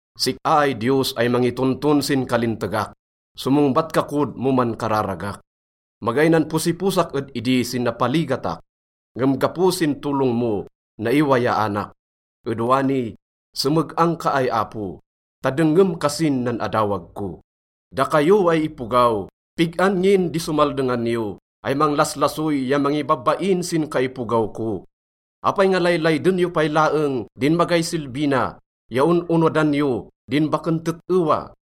Sik-a ay Diyos ay mangitonton sin kalintegak, somongbat ka kod mo mankararagak. Magay nanposiposak ed idi sin napaligatak, ngem gapo sin tolong mo, naiwayaanak. Ed wani, someg-ang ka ay Apo, ta dengngem kasin nan adawag ko. Dakayo ay ipogaw, pig-an ngin di somaldengan yo ay manglaslasoy ya mangibabain sin kaipogaw ko? Apay nga laylayden yo pay laeng din magay silbi na ya on-onodan yo din baken tet-ewa?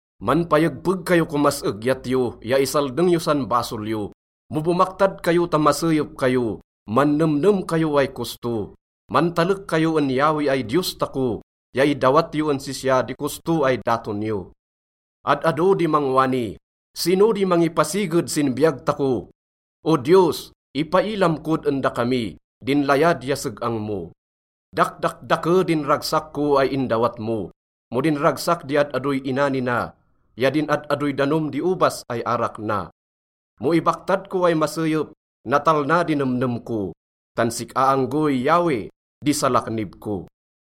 Manpayegpeg kayo komas egyat yo ya isaldeng yo san basol yo. Mo bomaktad kayo ta maseyep kayo, mannemnem kayo ay kosto. Mantalek kayo en Yahweh ay Diyos tako ya idawat yo en sisya di kosto ay daton yo. Ad-ado di mangwani, “Sino di mangipasiged sin biyag tako?” O Diyos, ipailam kod en dakami din layad ya seg-ang mo. Dakdakdake din ragsak ko ay indawat mo mo din ragsak di ad-adoy inani na ya din ad-adoy danom di obas ay arak na. Mo ibaktad ko ay maseyep, natalna di nemnem ko, tan sik-a anggoy, Yahweh, di salaknib ko.